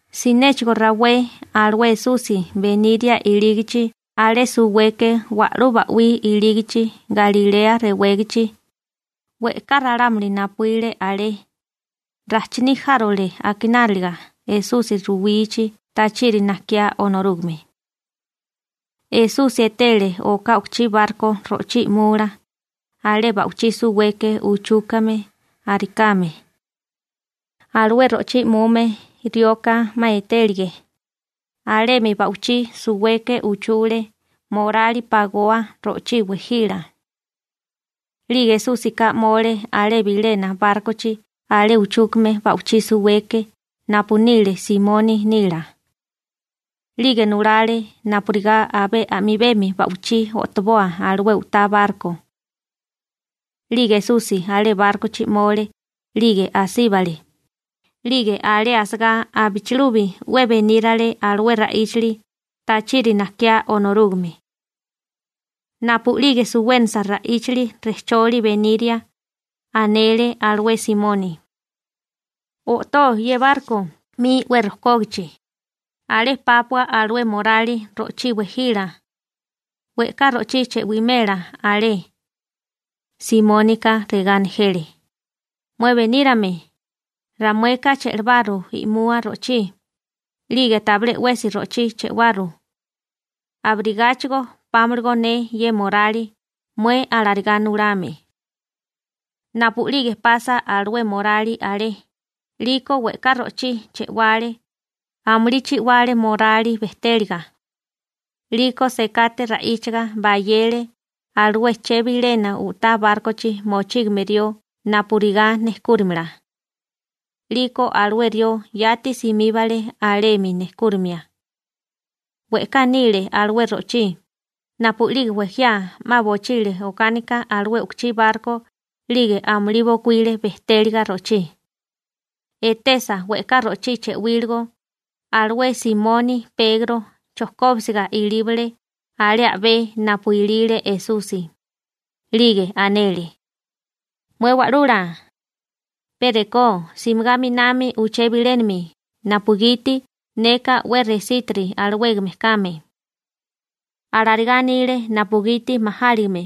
Sinéchigo rawé alué Esusi beniria ilígachi alé suweke wa'lú ba'wí ilígichi Galilea rewégachi, we'ká ralámuli napuíle alé, rajchiní járole akináliga Esusi ruwichi tachiri najkiá Onorúgame. Esusi etele oká u'kuchí barko ro'chí i'mula alé ba'wichí suweke uchúkame arikame. Alué ro'chí i'mume rioka 'ma e'tegílige, alemi ba'wichí suweke uchule morali pagoa ro'chí wejila. 'Lige Esúsika 'mole alé bilena bárkochi alé chujkúgame ba'wichí suweke napu nile Simoni nila. 'Lige nulale napurigá abé a'mibemi ba'wichí o'toboa alué u'tá barko. 'Lige Esusi alé bárkochi 'mole 'lige asíbale, 'lige alé asagá abichilubi 'we benírale alué ra'íchali tachiri najkiá Onorúgame. Napu'lige suwénasa ra'íchali rejcholi beniria, anele alué Simoni: ―O'tó ye barko 'mi 'we rojkógachi, alé pápua alué morali ro'chí wejila, we'ká ro'chí chewimela alé. Simónika regá nejele: ―Mué benírame, ramueka che'lebaru i'mua ro'chí, 'lige tabilé 'wesi ro'chí chewaru. Abirigáchigo pámalagó ne ye morali mué alarigá nulame. Napu'lige pasa alué morali alé, 'liko we'ká ro'chí che'wale, amulí chi'wale morali bejtéliga. 'Liko sekate ra'íchaga bayele alué chebilena u'tá bárkochi mochígame rió napurigá nejkúrimala. 'Liko alué rió yati simíbale alemi nejkúrimia. We'ká nile alué ro'chí, napu'lige wejiá 'ma bochile okánika alué u'kuchí barko 'lige amulí bokuíle bejtéliga ro'chí. Etesa we'ká ro'chí chewíligo, alué Simoni Pegro chojkóbisiga ilíbale alé a'bé napu ilile Esusi. 'Lige anele: ―Mué Wa'lula, pe rekó simigá 'minami uché bilénami napugiti neka 'we resítiri alawégame kame. Alarigá anile napugiti majáligime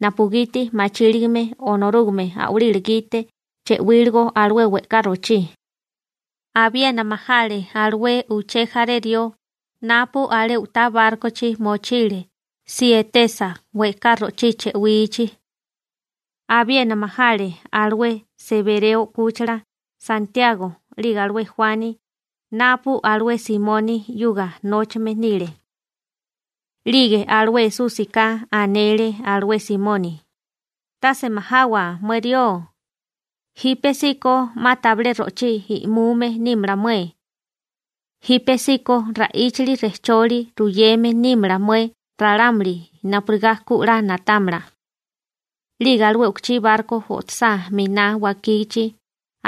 napugiti machíligame Onorúgame a'walila gite chewíligo alué we'ká ro'chí. Abiena majale alué uché jaré rió napu alé u'tá bárkochi mochile si etesa we'ká ro'chí chewichi. Abiena majale alué Sebereo 'kúchila Santiago 'lige alué Juani napu alué Simoni 'yuga nóchame nile. 'Lige alué Esúsika anele alué Simoni: ―Tase majawa mué rió, jípesíko 'ma tabilé ro'chí i'mume nímala mué. Jípesíko ra'íchali rejcholi ruyeme nímala mué ralámuli napurigá ku 'la na'támala. 'Lige alué u'kuchí barko o'tosá 'miná wakígichi,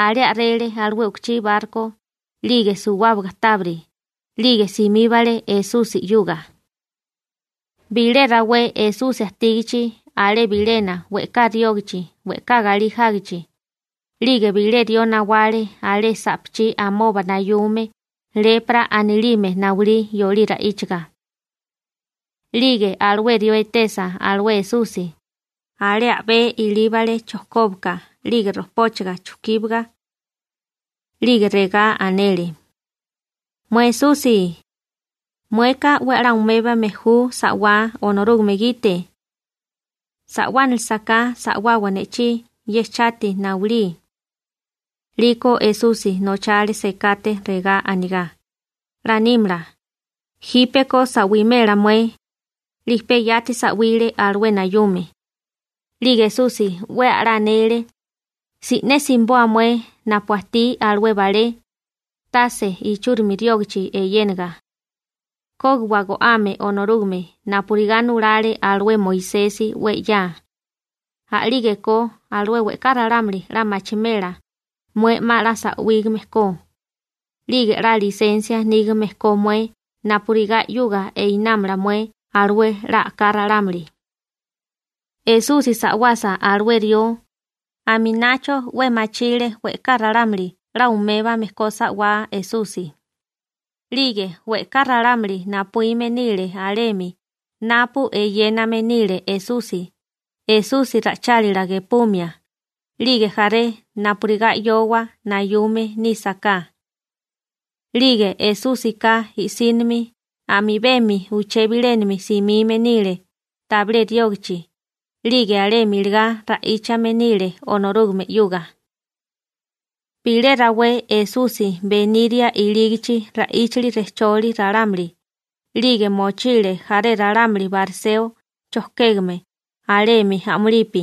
alé a'rele alué u'kuchí barko 'lige suwábaga tábiri, 'lige simíbale Esusi 'yuga. Bilé rawé Esusi ajtígachi alé bilena we'ká riógachi we'ká galí jágichi, 'lige bilé rió nawale alé sa'pachí amoba nayume «lepra» anilime nawilí yolí ra'íchaga. 'Lige alué rió etesa alué Esusi, alé a'bé ilíbale chojkóbaka 'lige rojpóchaga chujkíbiga. 'Lige regá anele: ―Mué Esusi, mueka 'we a'lá umébame ju sa'wá Onorúgame gite. Sa'wánilisaká sa'wawa ne'chí ye chati nayulí. 'Liko Esusi nochale sekate regá anigá: ―'La nímala. ¡Jípeko sa'wimela mué! 'Lige pe yati sa'wile alué nayume. 'Lige Esusi 'we a'lá anele: ―Si'né simiboa mué napu ajtí alué balé, tase ichúrimi riógachi eyénaga. Kógiwa go'ame Onorúgame napurigá nulale alué Moisesi 'we 'ya, a'lígeko alué we'ká ralámuli 'la machimela mué 'ma 'la sa'wígame ko, 'lige 'la lisensia nígame ko mué napurigá 'yuga einámala mué alué 'la a'ká ralámuli. Esusi sa'wasa alué rió, aminacho 'we machile we'ká ralámuli 'la umébame ko sa'wá Esusi, 'lige we'ká ralámuli napuíme nile alemi napu eyéname nile Esusi, Esusi ra'ichálila gepumia, 'lige jaré napurigá 'yowa nayume nísaká. 'Lige Esúsika i'sínimi a'mibemi uché bilénami simime nile tabilé riógachi 'lige alemi iligá ra'íchame nile Onorúgame 'yuga. Bilé rawé Esusi beniria ilígichi ra'íchali rejcholi ralámuli, 'lige mochile jaré ralámuli bariseo chojkégame alemi a'mulipi,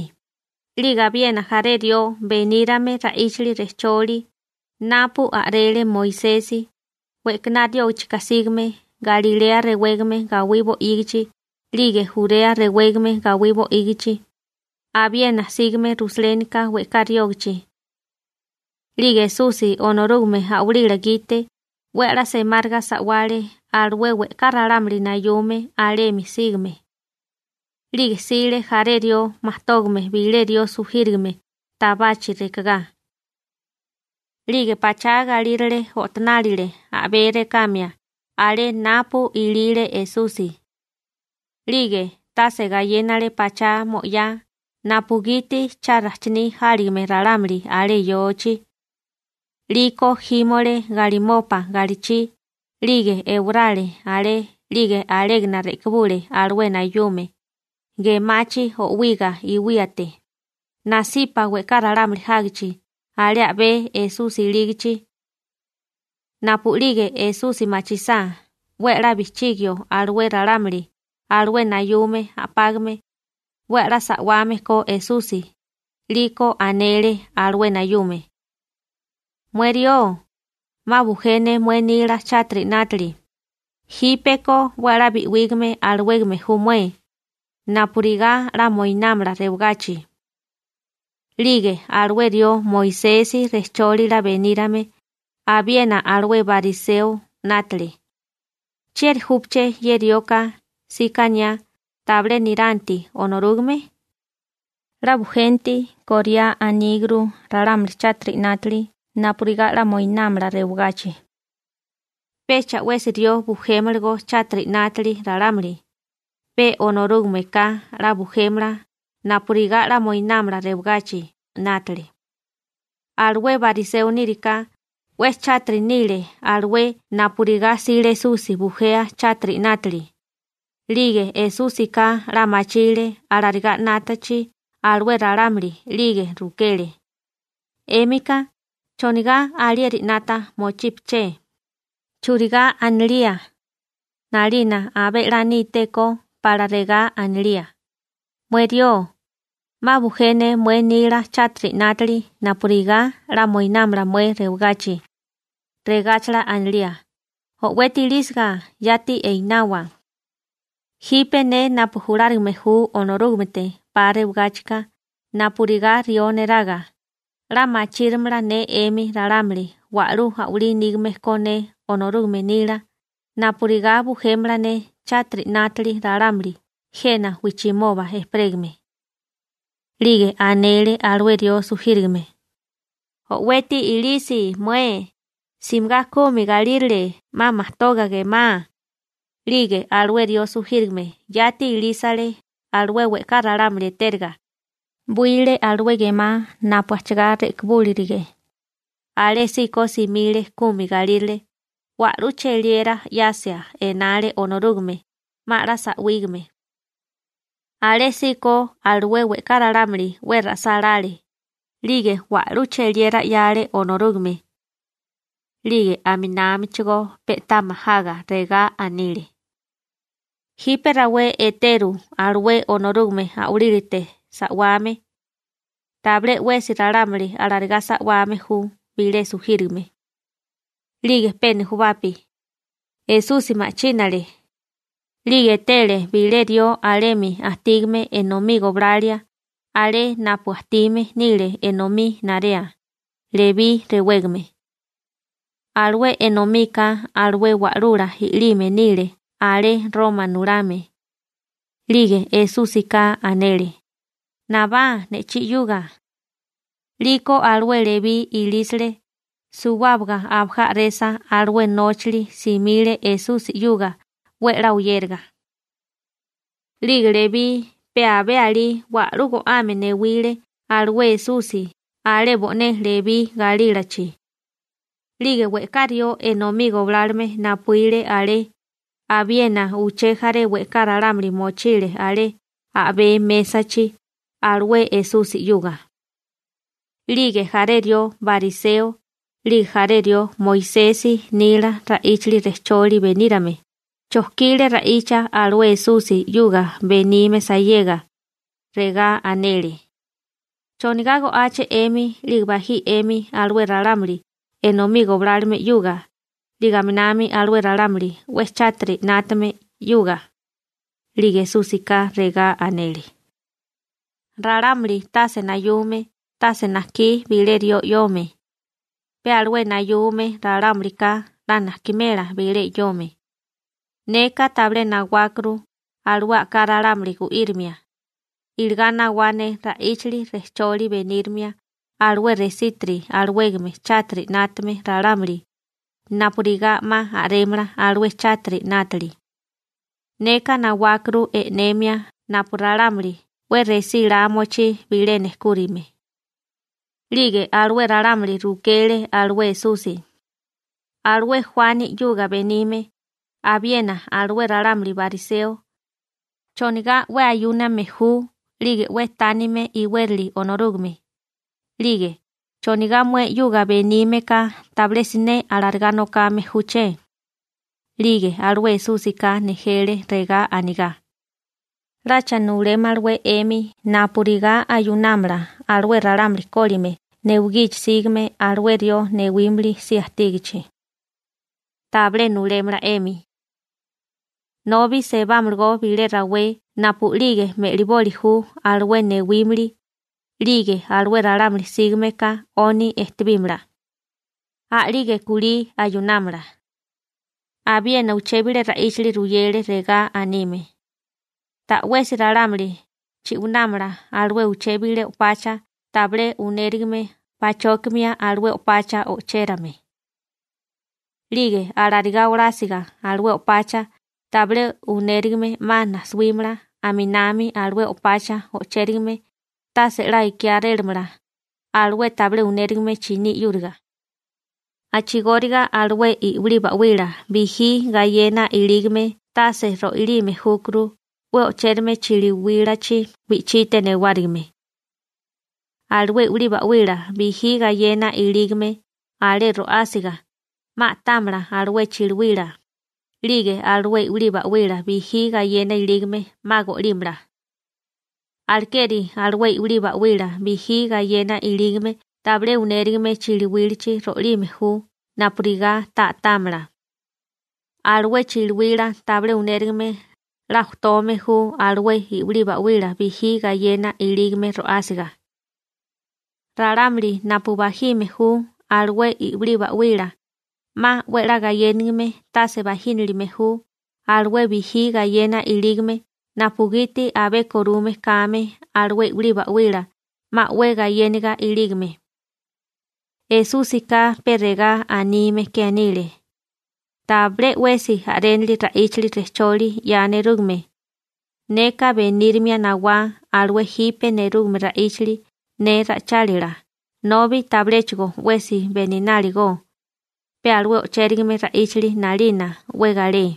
'lige abiena jaré rió benírame ra'íchali rejcholi napu a'rele Moisesi we'kaná riógachika sígame Galilea rewégame gawí bo'ígichi 'lige Jurea rewégame gawí bo'ígichi, abiena sígame Rusalénika we'ká riógachi. 'Lige Esusi Onorúgame a'walila gite 'we a'lá semáriga sa'wale alué we'ká ralámuli nayume alemi sígame. 'Lige jsile jaré rió majtógame bilé rió sujírigame tabachi rekagá. 'Lige pachá galírale o'tonálile a'bé rekamia alé napu ilile Esusi. 'Lige tase gayénale pachá mo'yá napugiti cha rajchiní jáligame ralámuli alé yochi. 'Liko jímole galimopa galichi 'lige ewarale alé 'lige alégana re'kibule alué nayume, gemachi o'wiga iwíate, nasipa we'ká ralámuli jágichi alé a'bé Esusi ilígichi. Napu'lige Esusi machisá 'we a'lá bijchigio alué ralámuli alué nayume a'págame 'we a'lá sa'wame ko Esusi, 'liko anele alué nayume: ―Mué rió, 'ma bujé ne mué nila chátiri 'nátili, jípeko 'we a'lá bi'wígame alawégame ju mué napurigá 'la moinámala rewagachi. 'Lige alué rió Moisesi rejchólila benírame abiena alué bariseo 'nátale: «¿Chieri júpaché ye rioka síkaniá tabilé niranti Onorúgame? 'La bujenti koriá aníguru ralámuli chátiri 'nátili napurigá 'la moinámala rewagachi. Pecha 'wesi rió bujémalagó chátiri 'nátili ralámuli, pe Onorúgameka 'la bujémala napurigá 'la moinámala rewagachi», 'nátale. Alué bariseo níriká 'we chátiri nile alué napurigá 'sile Esusi bujea chátiri 'nátili. 'Lige Esúsika 'la machile alarigá 'nátachi alué ralámuli, 'lige rukele: ―'Émika ¿chonigá alieri 'nata mochípeché? ¿Churigá anilía 'nalina abé 'la nítékó pala regá anilía?: «Mué rió, 'ma bujé ne mué nila chátiri 'nátili napurigá 'la moinámala mué rewagachi», regáchala anilía: «¡O'weti ilísiga, yati einawa!» Jipe ne napu julárigame ju Onorúgamete 'pa rewagáchika napurigá rió neraga, 'la machírimala ne 'emi ralámuli wa'lú a'walí nígame ko ne Onorúgame nila napurigá bujémala ne chátiri 'nátili ralámuli jena wijchimoba ejperégame. 'Lige anele alué rió sujírigame: ―O'weti ilisi mué, simigá kumi galírale 'ma majtoga gemá. 'Lige alué rió sujírigame yati ilísale alué we'ká ralámuli etériga, 'wile alué gemá napu ajchagá re'kibúlirige, alésíko simile kumi galírale, wa'lú cheliera 'yasia enale Onorúgame, 'ma 'la sa'wígame. Alésíko alué we'ká ralámuli 'we ra'sálále, 'lige wa'lú cheliera 'yale Onorúgame. 'Lige aminámichigó pe'tá majaga regá anile: ―Jipe rawé eteru alué Onorúgame a'walílate sa'wame. Tabilé 'wesi ralámuli alarigá sa'wame ju bilé sujírigame. 'Lige pe nujubapi Esusi ma'chínale, 'lige etele bilé rió alemi ajtígame enomí goblalia alé napu ajtime nile enomí narea, Lebí rewégame. Alué enomika alué wa'lula i'lime nile alé Roma nulame. 'Lige Esúsika anele: ―Nabá ne'chí 'yuga. 'Liko alué Lebí ilísile, suwábaga abajá a'resa alué nóchali simile Esusi 'yuga 'we 'la oyériga. 'Lige Lebí pe abé alí wa'lú go'ame newile alué Esusi alé bo'né Lebí galílachi. 'Lige we'ká rió enomí goblálome napuíle alé, abiena uché jaré we'ká ralámuli mochile alé a'bé mésachi alué Esusi 'yuga. 'Lige jaré rió bariseo, 'lige jaré rió Moisesi nila ra'íchali rejcholi benírame, chojkile ra'icha alué Esusi 'yuga benime sayega. Regá anele: ―¿Chonigá go'áché 'emi 'lige bají 'emi alué ralámuli enomí goblálome 'yuga 'lige aminami alué ralámuli 'we chátiri 'nátame 'yuga? 'Lige Esúsika regá anele: ―Ralámuli tase nayume tase najkí bilé rió 'yome, pe alué nayume ralámulika 'la najkimela bilé 'yome. Neka tabilé nawákuru alué a'ká ralámuli gu'írimia, iligá nawá ne ra'íchali rejcholi benírimia alué resiti alawégame chátiri 'nátame ralámuli napurigá 'ma a'rémala alué chátiri 'nátili. Neka nawákuru e'nemia napu ralámuli 'we resílá mochí bilé nejkúrime. 'Lige alué ralámuli rukele alué Esusi: ―Alué Juani 'yuga benime, abiena alué ralámuli bariseo, ¿chonigá 'we ayúname ju 'lige 'we tánime iwérali Onorúgame? 'Lige ¿chonigá mué 'yuga benímeka tabilé siné alarigá nokame júché? 'Lige alué Esúsika nejele regá anigá: ―¿'Lacha nulémalawé 'emi napurigá ayunámala alué ralámuli kólime newigichi sígame alué rió newímili si ajtígachi? Tabilé nulémala 'emi. Nobi sebámalagó bilé rawé napu'lige me'liboli ju alué newímili, 'lige alué ralámuli sígame ka 'oni ejtebímala. A'lige kulí ayunámala. Abiena uché bilé ra'íchili ruyele regá anime: ―Ta'wesi ralámuli chi'wanámala alué uché bilé o'pacha tabilé unérigame pachókimia alué o'pacha o'chérame. 'Lige alarigá olásiga alué o'pacha tabilé unérigame 'ma najsuímala, aminami alué o'pacha o'chérigame tase 'la ikiárélamala alué tabilé unérigame chiní 'yúriga. A'chigóriga alué i'wilí ba'wila bijí gayena ilígame tase ro'alime júkuru 'we o'chérame chiliwílachi wi'chite newárigime. Alué i'wilí ba'wila bijí gayena ilígame alé ro'ásiga, 'ma a'támala alué chiliwila, 'lige alué i'wilí ba'wila bijí gayena ilígame 'ma go'límala. Alekeri alué i'wilí ba'wila bijí gayena ilígame tabilé unérigame chiliwílachi ro'alime ju napurigá ta a'támala. Alué chiliwila tabilé unérigame 'la ojtome ju alué i'wilí ba'wila bijí gayena ilígame ro'ásiga. Ralámuli napu bajime ju alué i'wilí ba'wila 'ma 'we 'la gayénigime tase bajínilime ju alué bijí gayena ilígame napugiti abé korume kame alué i'wilí ba'wila 'ma 'we gayéniga ilígame. Esúsika pe regá anime ke anile: ―Tabilé 'wesi a'rénili ra'íchali rejcholi 'ya nerúgame. Neka benírimia nawá alué jipe nerúgame ra'íchali ne ra'ichálila nobi tabiléchigo 'wesi benináligó, pe alué o'chérigame ra'íchali 'nalina 'we galé.